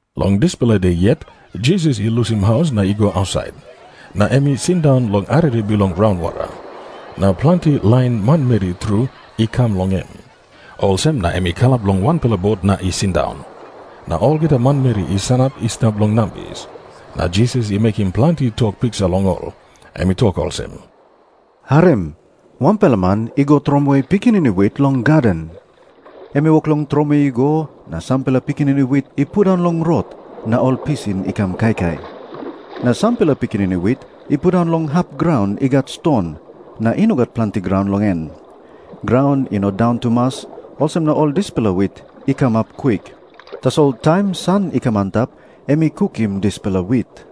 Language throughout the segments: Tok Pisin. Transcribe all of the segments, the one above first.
Long dispela de yet Jisas i lusim haus na i go ausait. Na em i sindaun long arere bilong raunwara. Na planti lain manmeri tru i kam long em. Olsem na em i kalap long bot na i sindaun, na olgeta manmeri i sanap i stap long nambis. Na Jisas i mekim planti tok piksa long ol. Em i tok olsem, "Harim. Wanpela man i tromoi pikinini wit long gaden. Em i wok long tromoi i go, na sampela pikinini wit i pundaun long rot, na ol pisin i kam kaikai. Na sampela pikinini wit i pundaun long hap graun i gat ston, na i no gat planti graun long en. Graun i no daun tumas, olsem na ol dispela wit i kamap kwik. Tasol taim san i kam antap em i kukim dispela wit.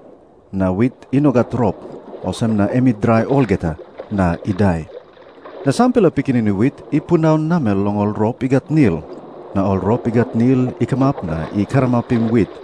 Na wit i no gat rop, olsem na em i drai olgeta, na i dai. Na sampela pikinini wit i pundaun namel long ol rop i gat nil. Na ol rop i gat nil i kamap na i karamapim wit.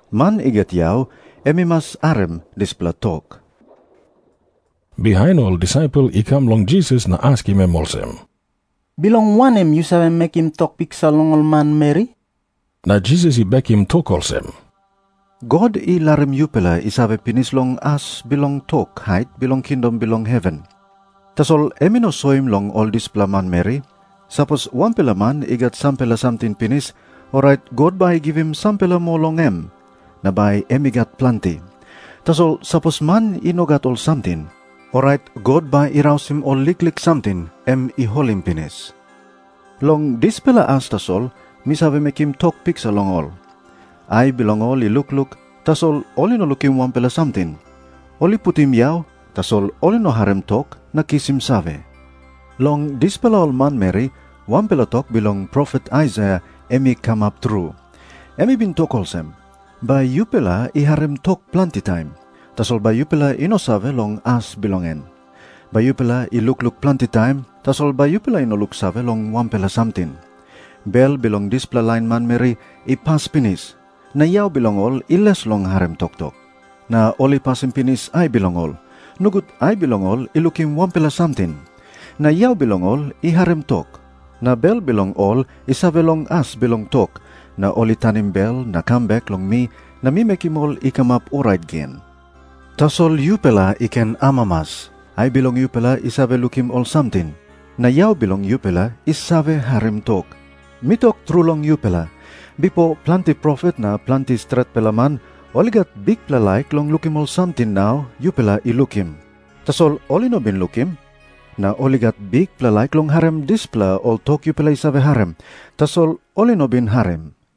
Man i gat yau em i mas harim dispela tok." Bihain ol disaipel i kam long Jisas na askim em olsem, "Bilong wanem yu save mekim tok piksa long ol manmeri?" Na Jisas i bekim tok olsem, "God i larim yupela i save pinis long as bilong tok hait bilong kingdom bilong heven. Tasol em i no soim long ol dispela manmeri. Sapos wanpela man i gat sampela samting pinis, orait God bai i givim sampela moa long em, na bai em i gat planti. Tasol sapos man i no gat ol samting, orait God bai i tekewe ol liklik samting em i holim pinis. Long dispela as tasol mi save mekim tok piksa long ol. Ai bilong ol i lukluk, tasol ol i no lukim wanpela samting. Ol i putim yau, tasol ol i no harim tok na kisim save. Long dispela ol manmeri, wanpela tok bilong profet Aisaia em i kamap tru. Em i bin tok olsem, 'Bai yupela i harim tok planti taim, tasol bai yupela i no save long as bilong en. Bai yupela i lukluk planti taim, tasol bai yupela i no luksave long wanpela samting. Bel bilong dispela lain manmeri i pas pinis, na yau bilong ol i les long harim toktok, na ol i pasim pinis ai bilong ol, nogut ai bilong ol i lukim wanpela samting, na yau bilong ol i harim tok, na bel bilong ol i save long as bilong tok, na ol i tanim bel na kam bek long mi na mi mekim ol i kamap orait gen.' "Tasol yupela i ken amamas. Ai bilong yupela i save lukim ol samting. Na yau bilong yupela i save harim tok. Mi tok tru long yupela, bipo planti profet na planti stretpela man ol i gat bikpela laik long lukim ol samting nau yupela i lukim, tasol ol i no bin lukim. Na ol i gat bikpela laik long harim dispela ol tok yupela i save harim, tasol ol i no bin harim."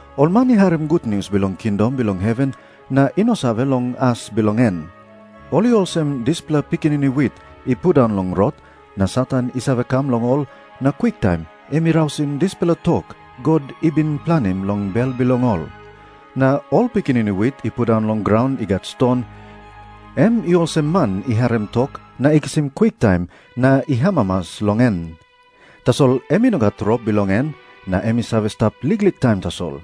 Ol man i harim gutnius bilong kingdom bilong heven na i no save long as bilong en, ol i olsem dispela pikinini wit i pundaun long rot, na Satan i save kam long ol na kwiktaim em i rausim dispela tok God i bin planim long bel bilong ol. Na ol pikinini wit i pundaun long graun i gat ston, em i olsem man i harim tok na i kisim kwiktaim na i amamas long en. Tasol em i no gat rop bilong en, na em i save stap liklik taim tasol.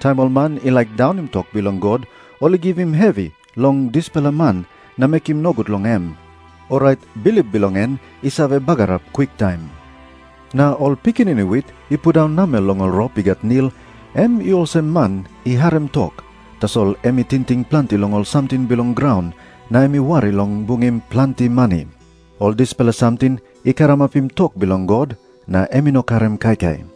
Taim ol man i laik daunim tok bilong God ol i givim hevi long dispela man na mekim nogut long em, orait bilip bilong en i save bagarap kwiktaim. Na ol pikinini wit i pundaun namel long ol rop i gat nil, em i olsem man i harim tok, tasol em i tingting planti long ol samting bilong graun, na em i wari long bungim planti mani. Ol dispela samting i karamapim tok bilong God, na em i no karim kaikai.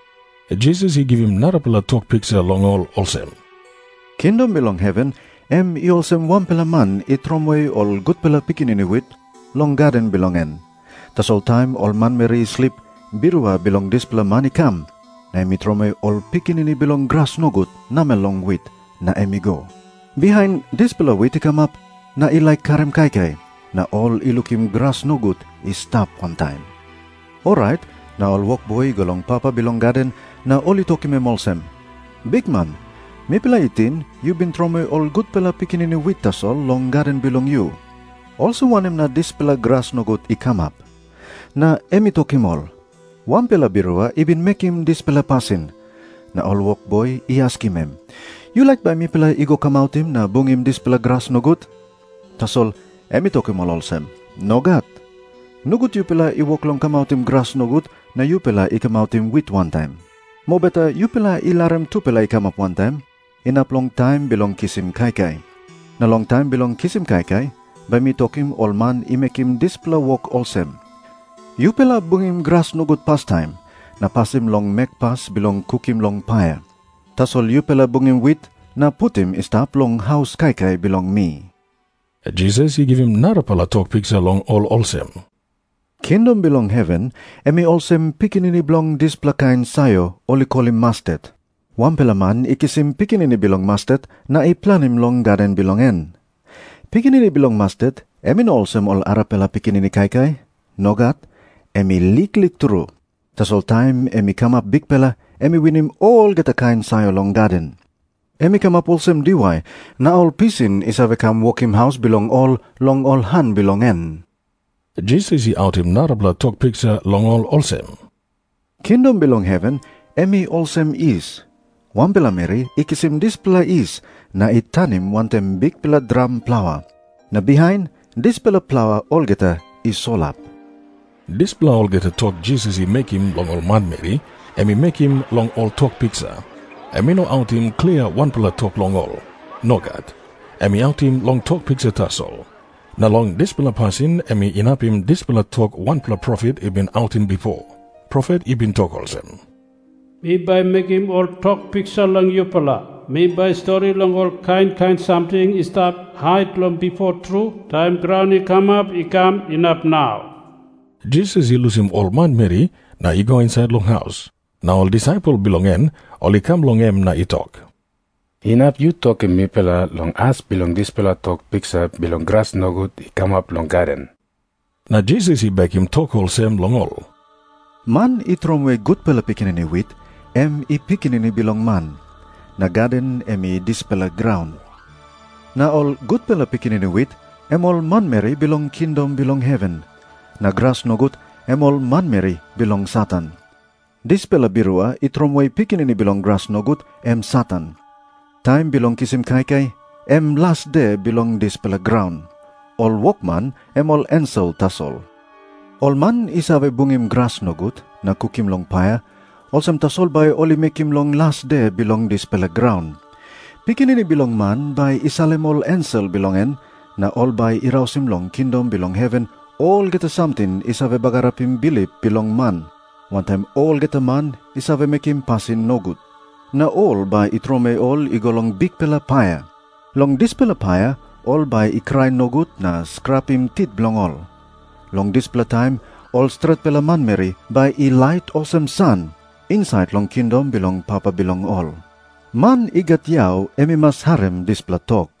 Jisas i givim narapela tok piksa long ol olsem, "Kingdom bilong heven em i olsem wanpela man i tromoi ol gutpela pikinini wit long gaden bilong en. Tasol taim ol manmeri i slip, birua bilong dispela man i kam, na em i tromoi ol pikinini bilong gras nogut namel long wit, na em i go. Bihain dispela wit i kamap na i laik karim kaikai, na ol i lukim gras nogut i stap wantaim. Orait na ol wokboi i go long papa bilong gaden na ol i tokim em olsem, 'Bikman, mipela i ting yu bin tromoi ol gutpela pikinini wit tasol long gaden bilong yu. Olsem wanem na dispela gras nogut i kamap?' "Na em i tokim ol, 'Wanpela birua i bin mekim dispela pasin.' Na ol wokboi i askim em, 'Yu laik bai mipela i go kamautim na bungim dispela gras nogut?' Tasol em i tokim ol olsem, 'Nogat. Nogut yupela i wok long kamautim gras nogut na yupela i kamautim wit wantaim. Mobeta yupela i larim tupela i kamap wantaim, inap long taim bilong kisim kaikai. Na long taim bilong kisim kaikai bai mi tokim ol man i mekim dispela wok olsem, "Yupela bungim gras nogut pastaim, na pasim long mekpas bilong kukim long paia. Tasol yupela bungim wit na putim i stap long haus kaikai bilong mi."' Jisas i givim narapela tok piksa long ol olsem, "Kingdom bilong heven em i olsem pikinini bilong dispela kain sayor ol i kolim mastet. Wanpela man i kisim pikinini bilong mastet na i planim long gaden bilong en. Pikinini bilong mastet em i no olsem ol arapela pikinini kaikai. Nogat. Em i liklik tru. Tasol taim em i kamap bikpela, em i winim olgeta kain sayor long gaden. Em i kamap olsem diwai, na ol pisin i save kam wokim haus bilong ol long ol han bilong en." Jisas i autim narapela tok piksa long ol olsem, "Kingdom bilong heven em i olsem yis. Wanpela meri i kisim dispela yis na i tanim wantaim bikpela dram plaua. Na bihain dispela plaua olgeta i solap." Dispela olgeta tok Jisas i mekim long ol manmeri em i mekim long ol tok piksa. Em i no autim klia wanpela tok long ol. Nogat. Em i autim long tok piksa tasol. Na long dispela pasin em inapim dispela tok wanpela profet i bin autim bipo. Profet i bin tok olsem, "Mi bai mekim ol tok piksa long yupela Mi bai stori long ol kain kain samting i stap hait long bipo tru, taim graun i kamap i kam inap nau." Jisas i lusim ol manmeri na i go insait long haus. Na ol disaipel bilong en ol i kam long em na i tok, "Inap yu tokim mipela long as bilong dispela tok piksa bilong gras nogut i kamap long gaden?" Na Jisas i bekim tok olsem long ol, "Man i tromoi gutpela pikinini wit, em i Pikinini Bilong Man. Na gaden em i dispela graun. Na ol gutpela pikinini wit, em ol manmeri bilong kingdom bilong heven. Na gras nogut, em ol manmeri bilong Satan. Dispela birua i tromoi pikinini bilong gras nogut, em Satan. Taim bilong kisim kaikai, em las de bilong dispela graun. Ol wokman em ol ensel tasol. Ol man i save bungim gras nogut na kukim long paia, olsem tasol bai ol i mekim long las de bilong dispela graun. Pikinini Bilong Man bai i salim ol ensel bilong en, na ol bai i rausim long kingdom bilong heven olgeta samting i save bagarapim bilip bilong man, wantaim olgeta man i save mekim pasin nogut. Na ol bai i tromoi ol i go long bikpela paia. Long dispela paia ol bai i krai nogut na skrapim tit bilong ol. Long dispela taim ol stretpela manmeri bai i lait olsem san, insait long kingdom bilong Papa bilong ol. Man i gat yau em i mas harim dispela tok."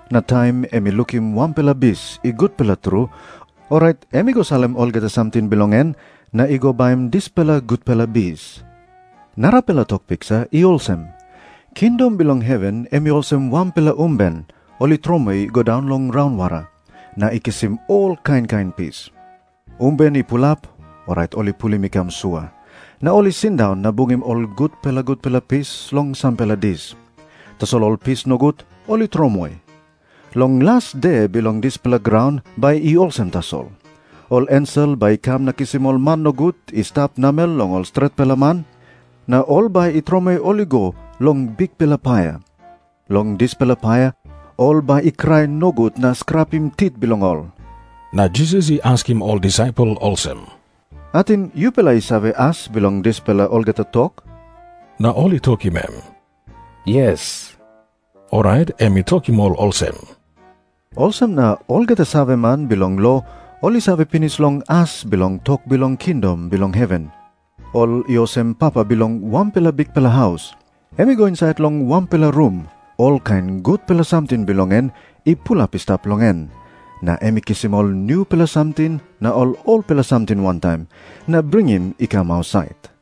Na taim em i lukim wanpela bis i gutpela tru, orait em i go salim olgeta samting bilong en na i go baim dispela gutpela bis." Jisas i tok moa olsem, "Narapela tok piksa i olsem. Kingdom bilong heven em i olsem wanpela umben ol i tromoi i go daun long raunwara, na i kisim ol kain kain pis. Umben i pulap, orait ol i pulim i kam sua. Na ol i sindaun na bungim ol gutpela gutpela pis long sampela dis. Tasol ol pis nogut ol i tromoi. Long las de bilong dispela graun bai i olsem tasol. Ol ensel bai i kam na kisim ol man nogut i stap namel long ol stretpela man. Na ol bai i tromoi ol i go long bikpela paia. Long dispela paia ol bai i krai nogut na skrapim tit bilong ol." Na Jisas i askim ol disaipel olsem, "Ating yupela i save as bilong dispela olgeta tok?" Na ol i tokim em, "Yes." Orait em i tokim ol olsem, "Olsem na olgeta saveman bilong lo ol i save pinis long as bilong tok bilong kingdom bilong heven, ol i olsem papa bilong wanpela bikpela haus. Em i go insait long wanpela rum olkain gutpela samting bilong en i pulap i stap long en, na em i kisim ol nupela samting na ol olpela samting wantaim, na bringim i kam ausait."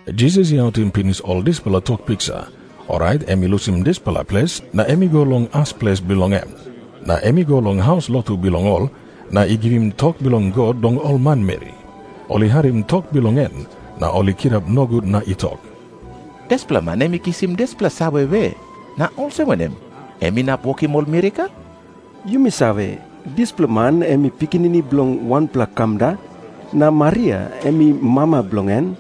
Jisas i autim pinis ol dispela tok piksa, orait em i lusim dispela ples na em i go long as ples bilong en. Na em i go long haus lotu bilong ol na i givim tok bilong God long ol manmeri. Ol i harim tok bilong en na ol i kirap nogut na i tok, "Dispela man em i kisim dispela save we? Na olsem wanem em inap wokim ol mirakel? Yumi save, dispela man em i pikinini bilong wanpela kamda, na Maria em i mama bilong en.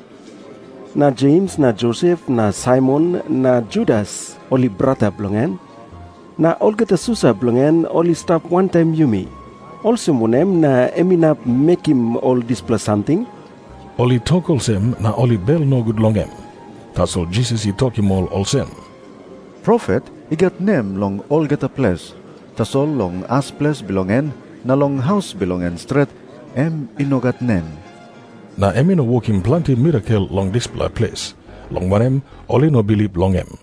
Na Jems na Josep na Saimon na Judas, ol i brata bilong en. Na olgeta susa bilong en, ol i stap wantaim yumi. Olsem wanem na em inap mekim ol dispela samting?" Ol i tok olsem na ol i bel nogut long em. Tasol Jisas i tokim ol olsem "Profet i gat nem long olgeta ples. Tasol long as ples bilong en na long haus bilong en stret em i no gat nem." Na em i no wokim planti mirakel long dispela ples, long wanem, ol i no bilip long em.